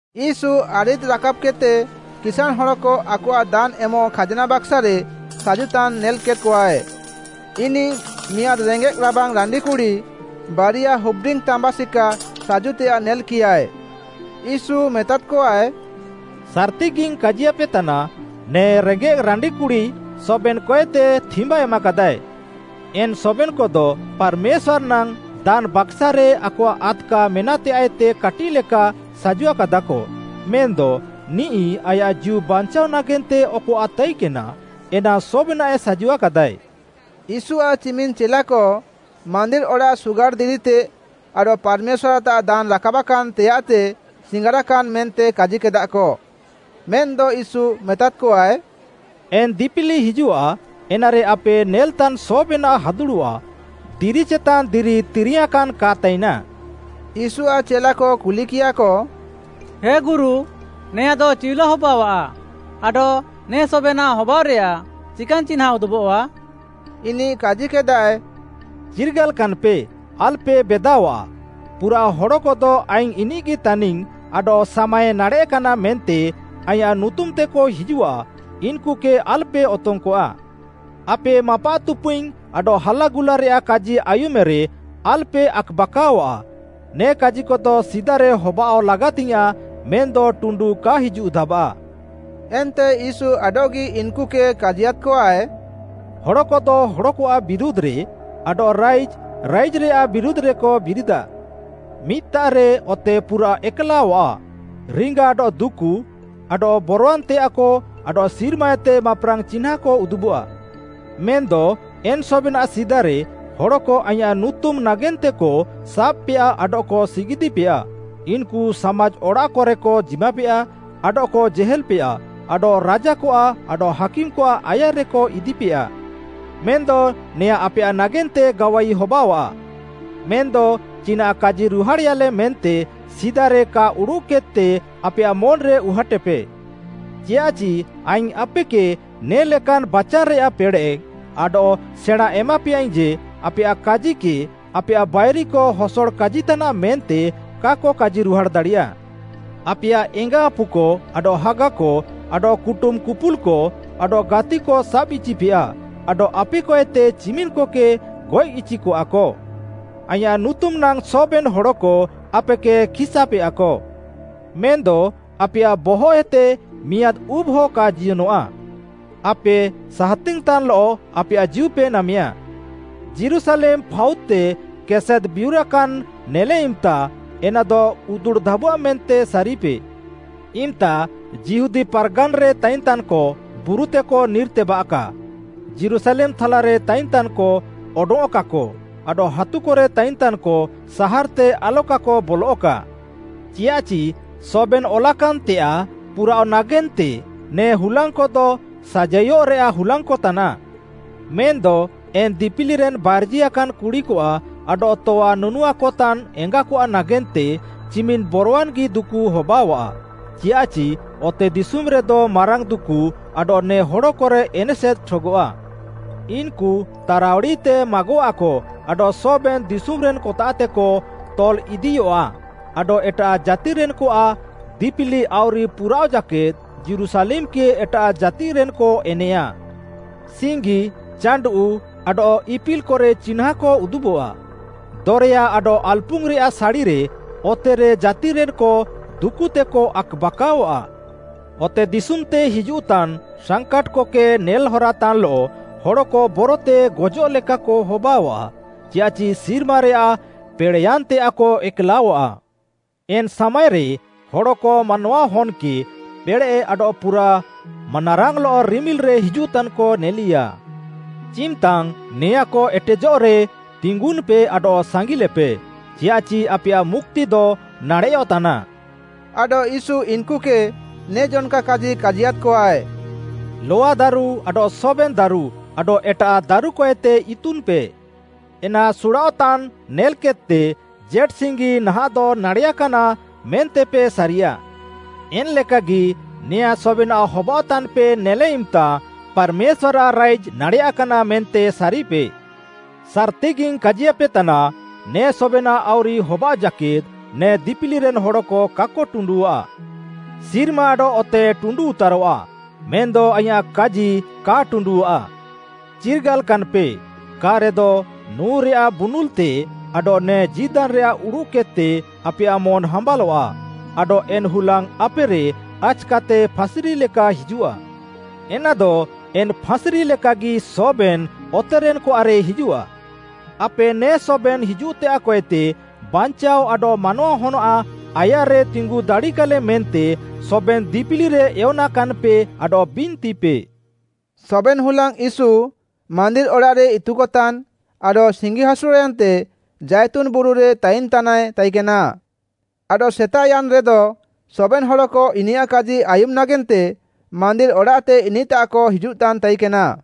ୟୀଶୁ ଆରିଦ୍‌ ରାକାବ୍‌କେଦ୍‌ତେ କିସାଁଣ୍‌ ହଡ଼କ ଆକଆଃ ଦାନ୍‌ ଏମଃ ଖାଜ୍‌ନା ବାକାସ୍‌ରେ ସାଜୁତାନ୍‌ ନେଲ୍‌କେଦ୍‌କଆଏ। ଇନିଃ ମିଆଁଦ୍‌ ରେଙ୍ଗେଃ ରାବାଙ୍ଗ୍‌ ରାଣ୍ଡିକୁଡ଼ି ବାରିଆ ହୁପ୍‌ଡିଙ୍ଗ୍‌ ତାମ୍ବା ସିକା ସାଜୁତେୟାଃ ନେଲ୍‌କିୟାଏ। ୟୀଶୁ ମେତାଦ୍‌କଆଏ, “ସାର୍‌ତିଗିଙ୍ଗ୍‌ କାଜିୟାପେତାନା, ନେ ରେଙ୍ଗେଃ ରାଣ୍ଡିକୁଡ଼ି ସବେନ୍‌କଏତେ ଥିମ୍ୱା ଏମାକାଦାଃଏ। ଏନ୍‌ ସବେନ୍‌କଦ ପାର୍‌ମେଶ୍ୱାର୍‌ ନାଙ୍ଗ୍‌ ଦାନ୍‌ ବାକାସ୍‌ରେ ଆକଆଃ ଆଦ୍‌କା ମେନାଃତେୟାଃଏତେ କାଟିଃଲେକା ସାଜୁଆକାଦାଃକ ମେନ୍‌ଦ ନିଃ ଆୟାଃ ଜୀଉ ବାଞ୍ଚାଅ ନାଗେନ୍ତେ ଅକ୍‌ନାଃ ତାଇକେନା, ଏନା ସବେନାଃଏ ସାଜୁଆକାଦାଏ।” ୟୀଶୁଆଃ ଚିମିନ୍‌ ଚେଲାକ ମାନ୍ଦିର୍‌ ଅଡ଼ାଃ ସୁଗାଡ଼୍‌ ଦିରିତେ ଆଡଃ ପାର୍‌ମେଶ୍ୱାର୍‌ତାଃ ଦାନ୍‌ ରାକାବାକାନ୍‌ ତେୟାଃତେ ସିଙ୍ଗାରାକାନା ମେନ୍ତେ କାଜିକେଦାଃକ, ମେନ୍‌ଦ ୟୀଶୁ ମେତାଦ୍‌କଆଏ, “ଏନ୍‌ ଦିପିଲି ହିଜୁଃଆ, ଏନାରେ ଆପେ ନେଲେତାନ୍‌ ସବେନାଃ ହାଦୁଡ଼ଃଆ, ଦିରି ଚେତାନ୍‍ ଦିରି ତିରିୟାଁକାନ୍‍ କା ତାଇନା।” ୟୀଶୁଆଃ ଚେଲାକ କୁଲିକିୟାଃକ, “ହେ ଗୁରୁ, ନେଆଁଦ ଚିଉଲା ହବାଅଃଆ? ଆଡଃ ନେ ସବେନାଃ ହବାଅଃରେୟା ଚିକାନ୍‌ ଚିହ୍ନାଁ ଉଦୁବଃଆ?” ଇନିଃ କାଜିକେଦାଏ, “ଚିର୍ଗାଲାକାନ୍‍ପେ, ଆଲ୍‌ପେ ବେଦାଅଆଃ, ପୁରାଃ ହଡ଼କଦ ଆଇଙ୍ଗ୍‌ ଇନିଃଗି ତାନିଙ୍ଗ୍‌ ଆଡଃ ସାମାଏ ନାଡ଼େଃକାନା ମେନ୍ତେ ଆଇଁୟାଃ ନୁତୁମ୍‌ତେକ ହିଜୁଃଆ, ଇନ୍‌କୁକେ ଆଲ୍‌ପେ ଅତଙ୍ଗ୍‌କଆ। ଆପେ ମାପାଃତୁପୁଇଙ୍ଗ୍‌ ଆଡଃ ହାଲାଗୁଲାରେୟାଃ କାଜି ଆୟୁମେରେ ଆଲ୍‌ପେ ଆକ୍‌ବାକାଅଆଃ, ନେ କାଜିକଦ ସିଦାରେ ହବାଅଃଗି ଲାଗାତିୟାଃଁ, ମେନ୍‌ଦ ଟୁଣ୍ଡୁ କା ହିଜୁଃଧାବାଃ।” ଏନ୍ତେ ୟୀଶୁ ଆଡଃଗି ଇନ୍‌କୁକେ କାଜିୟାଦ୍‌କଆଏ, “ହଡ଼କଦ ହଡ଼କଆଃ ବିରୁଧ୍‌ରେ ଆଡଃ ରାଇଜ୍‌ ରାଇଜ୍‌ରେୟାଃ ବିରୁଧ୍‌ରେକ ବିରିଦାଃ। ମିଦ୍‌ତାଃରେ ଅତେ ପୁରାଃ ଏକ୍‌ଲାଅଃଆ, ରିଙ୍ଗା ଆଡଃ ଦୁକୁ, ଆଡଃ ବରଆନ୍‌ତେୟାଃକ ଆଡଃ ସିର୍ମାଏତେ ମାପ୍‌ରାଙ୍ଗ୍‌ ଚିହ୍ନାଁକ ଉଦୁବଃଆ। ମେନ୍‌ଦ ଏନ୍‌ ସବେନାଃ ସିଦାରେ, ହଡ଼କ ଆଇଁୟାଃ ନୁତୁମ୍‌ ନାଗେନ୍ତେକ ସାବ୍‌ପେୟା ଆଡଃକ ସିଗିଦ୍‌ପେୟା। ଇନ୍‌କୁ ସାମାଜ୍‌ ଅଡ଼ାଃକରେକ ଜିମାପେୟା ଆଡଃକ ଜେହେଲ୍‌ପେୟା, ଆଡଃ ରାଜାକଆଃ ଆଡଃ ହାକିମ୍‌କଆଃ ଆୟାର୍‌ରେକ ଇଦିପେୟା। ମେନ୍‌ଦ ନେଆଁଁ ଆପେୟାଃ ନାଗେନ୍ତେ ଗାୱାଇ ହବାଅଆଃ। ମେନ୍‌ଦ ଚିନାଃ କାଜିରୁହାଡ଼େୟାଲେ ମେନ୍ତେ ସିଦାରେ କା ଉଡ଼ୁଃକେଦ୍‌ତେ ଆପେୟାଃ ମନ୍‌ରେ ଉହାଟେପେ। ଚିୟାଃଚି ଆଇଙ୍ଗ୍‌ ଆପେକେ ନେ'ଲେକାନ୍‌ ବାଚାନ୍‌ରେୟାଃ ପେଡ଼େଃ ଆଡଃ ସେଣାଁ ଏମାପେୟାଇଙ୍ଗ୍‌ ଯେ, ଆପେୟାଃ କାଜିକେ ଆପେୟାଃ ବାଇରିକ ହସଡ଼ କାଜିତାନାଃ ମେନ୍ତେ କାକ କାଜିରୁହାଡ଼୍‌ ଦାଡ଼ିୟା। ଆପେୟାଃ ଏଙ୍ଗା ଆପୁକ ଆଡଃ ହାଗାକ ଆଡଃ କୁଟୁମ୍‌କୁପୁଲ୍‌କ ଆଡଃ ଗାତିକ ସାବ୍‌ଇଚିପେୟା ଆଡଃ ଆପେକଏତେ ଚିମିନ୍‌କକେ ଗଏଃଇଚିକଆକ। ଆଇଁୟାଃ ନୁତୁମ୍‌ ନାଙ୍ଗ୍‌ ସବେନ୍‌ ହଡ଼କ ଆପେକେ ଖିସ୍‌ଆପେୟାକ। ମେନ୍‌ଦ ଆପେୟାଃ ବହଃଏତେ ମିଆଁଦ୍‌ ଉବ୍‌ହ କା ଜିୟନଃଆ। ଆପେ ସାହାତିଙ୍ଗ୍‌ ତାନ୍‌ଲଃ ଆପେୟାଃ ଜୀଉପେ ନାମେୟା। “ଯୀରୁଶାଲେମ୍‌ ଫାଉଦ୍‌ତେ କେସେଦ୍‌ବିୟୁରାକାନ୍‌ ନେଲେ ଇମ୍‌ତା, ଏନାଦ ଉତୁଡ଼୍‌ଧାବଆଃ ମେନ୍ତେ ସାରିପେ। ଇମ୍‌ତା ଯିହୁଦା ପାର୍‌ଗାନ୍‌ରେ ତାଇନଃତାନ୍‌କ ବୁରୁତେକ ନିର୍‌ତେବାଃକା, ଯୀରୁଶାଲେମ୍‌ ଥାଲାରେ ତାଇନ୍‌ତାନ୍‌କ ଅଡଙ୍ଗ୍‌ଅଃକାକ ଆଡଃ ହାତୁକରେ ତାଇନ୍‌ତାନ୍‌କ ସାହାର୍‌ତେ ଆଲକାକ ବଲଃକା। ଚିୟାଃଚି ସବେନ୍‌ ଅଲାକାନ୍‌ତେୟାଃ ପୁରାଅଃ ନାଗେନ୍ତେ ନେ ହୁଲାଙ୍ଗ୍‌କଦ ସାଜାଇଅଃରେୟାଃ ହୁଲାଙ୍ଗ୍‌ ତାନାଃ। ମେନ୍‌ଦ ଏନ୍‍ ଦିପିଲିରେନ୍‌ ବାର୍ଜିଆକାନ୍‍ କୁଡ଼ିକଆଃ ଆଡଃ ତଆ ନୁନୁଆକତାନ୍‍ ଏଙ୍ଗାକଆଃ ନାଗେନ୍ତେ ଚିମିନ୍‌ ବରୱାନ୍‌ଗି ଦୁକୁ ହବାଅଆଃ। ଚିୟାଃଚି ଅତେଦିଶୁମ୍‌ରେଦ ମାରାଙ୍ଗ୍‌ ଦୁକୁ ଆଡଃ ନେ ହଡ଼କରେ ଏନେସେଦ୍ ଠଗଃଆ। ଇନ୍‌କୁ ତାରାଉଡ଼ିତେ ମାଗଆଃକ ଆଡଃ ସବେନ୍‌ ଦିଶୁମ୍‌ରେନ୍‌କତାଃତେକ ତଲ୍‌ଇଦିୟଆଃ ଆଡଃ ଏଟାଃ ଜାତିରେନ୍‌କଆଃ ଦିପିଲି ଆଉରି ପୁରାଅଃଜାକେଦ୍‌ ଯୀରୁଶାଲେମ୍‌କେ ଏଟାଃ ଜାତିରେନ୍‌କ ଏନେଁୟା। “ସିଙ୍ଗି, ଚାଣ୍ଡୁଃ, ଆଡଃ ଇପିଲ୍‌କରେ ଚିହ୍ନାଁକ ଉଦୁବଃଆ। ଦରେୟା ଆଡଃ ଆଲ୍‌ପୁଙ୍ଗ୍‌ରେୟାଃ ସାଡ଼ିରେ, ଅତେରେ ଜାତିରେନ୍‌କ ଦୁକୁତେକ ଆକ୍‌ବାକାଅଆଃ। ଅତେଦିଶୁମ୍‌ତେ ହିଜୁଃତାନ୍‌ ସାଙ୍କାଟ୍‌କେ ନେଲ୍‌ହରାତାନ୍‌ଲଃ ହଡ଼କ ବରତେ ଗଜଃ ଲେକାକ ହବାଅଃଆ, ଚିୟାଃଚି ସିର୍ମାରେୟାଃ ପେଡ଼େଃୟାନ୍‌ତେୟାଃକ ଏକ୍‌ଲାଅଃଆ। ଏନ୍‌ ସାମାଏରେ ହଡ଼କ ମାନୱାହନ୍‌କେ ପେଡ଼େଃ ଆଡଃ ପୁରାଃ ମାନାରାଙ୍ଗ୍‌ଲଃ ରିମିଲ୍‌ରେ ହିଜୁଃତାନ୍‌କ ନେଲିୟା। ଚିମ୍‌ତାଙ୍ଗ୍‌ ନେଆଁଁକ ଏଟେଜଃରେ ତିଙ୍ଗୁନ୍‌ପେ ଆଡଃ ସାଙ୍ଗିଲେପେ, ଚିୟାଃଚି ଆପେୟାଃ ମୁକ୍ତିଦ ନାଡ଼େୟଃତାନା।” ଆଡଃ ୟୀଶୁ ଇନ୍‌କୁକେ ନେ ଜନ୍‌କା କାଜି କାଜିୟାଦ୍‌କଆଏ, “ଲଆଦାରୁ ଆଡଃ ସବେନ୍‌ ଦାରୁ ଆଡଃ ଏଟାଃ ଦାରୁକଏତେ ଇତୁନ୍‌ପେ। ଏନା ସୁଡ଼ାଅଃତାନ୍‌ ନେଲ୍‌କେଦ୍‌ତେ ଜେଟ୍‌ସିଙ୍ଗି ନାହାଃଁଦ ନାଡ଼େୟାକାନା ମେନ୍ତେପେ ସାରିୟାଃ। ଏନ୍‌ଲେକାଗି, ନେଆଁଁ ସବେନାଃ ହବାଅଃତାନ୍‌ପେ ନେଲେ ଇମ୍‌ତା ପାର୍‌ମେଶ୍ୱାର୍‌ରାଃ ରାଇଜ୍‌ ନାଡ଼େୟାକାନା ମେନ୍ତେ ସାରିପେ।” ସାର୍‌ତିଗିଙ୍ଗ୍‌ କାଜିୟାପେତାନା, “ନେ ସବେନାଃ ଆଉରି ହବାଅଃ ଜାକେଦ୍‌ ନେ ଦିପିଲିରେନ୍‌ ହଡ଼କ କାକ ଟୁଣ୍ଡୁଃଆ। ସିର୍ମା ଆଡଃ ଅତେ ଟୁଣ୍ଡୁଉତାରଃଆ, ମେନ୍‌ଦ ଆଇଁୟାଃ କାଜିକ କା ଟୁଣ୍ଡୁଃଆ। “ଚିର୍ଗାଲାକାନ୍‌ପେ, କା'ରେଦ ନୁଁରେୟାଃ ବୁନୁଲ୍‌ତେ ଆଡଃ ନେ ଜୀଦାନ୍‌ରେୟାଃ ଉଡ଼ୁଃକେଦ୍‌ତେ ଆପେୟାଃ ମନ୍‌ ହାମ୍ବାଲଆଃ ଆଡଃ ଏନ୍‌ ହୁଲାଙ୍ଗ୍‌ ଆପେରେ ଆଚ୍‌କାତେ ଫାସ୍‌ରିଲେକା ହିଜୁଃଆ। ଏନାଦ ଏନ୍‌ ଫାଁସ୍‌ରି ଲେକାଗି ସବେନ୍‌ ଅତେରେନ୍‌କଆଃରେ ହିଜୁଃଆ। ଆପେ ନେ ସବେନ୍‌ ହିଜୁଃତେୟାଃକଏତେ ବାଞ୍ଚାଅ ଆଡଃ ମାନୱାହନ୍‌ଆଃ ଆୟାର୍‌ରେ ତିଙ୍ଗୁଃଦାଡ଼ିକାଲେ ମେନ୍ତେ ସବେନ୍‌ ଦିପିଲିରେ ଏୟନାକାନ୍‌ପେ ଆଡଃ ବିନ୍ତିପେ।” ସବେନ୍‌ ହୁଲାଙ୍ଗ୍‌ ୟୀଶୁ ମାନ୍ଦିର୍‌ ଅଡ଼ାଃରେ ଇତୁକତାନ୍‌ ଆଡଃ ସିଙ୍ଗିହାସୁର୍‌ୟାନ୍ତେ ଜାଇତୁନ୍‌ ବୁରୁରେ ତାଇନ୍‌ତାନାଏ ତାଇକେନା। ଆଡଃ ସେତାଃୟାନ୍‌ରେଦ ସବେନ୍‌ ହଡ଼କ ଇନିୟାଃ କାଜି ଆୟୁମ୍‌ ନାଗେନ୍ତେ ମାନ୍ଦିର୍‌ ଅଡ଼ାଃତେ ଇନିଃତାଃକ ହିଜୁଃତାନ୍‌ ତାଇକେନା।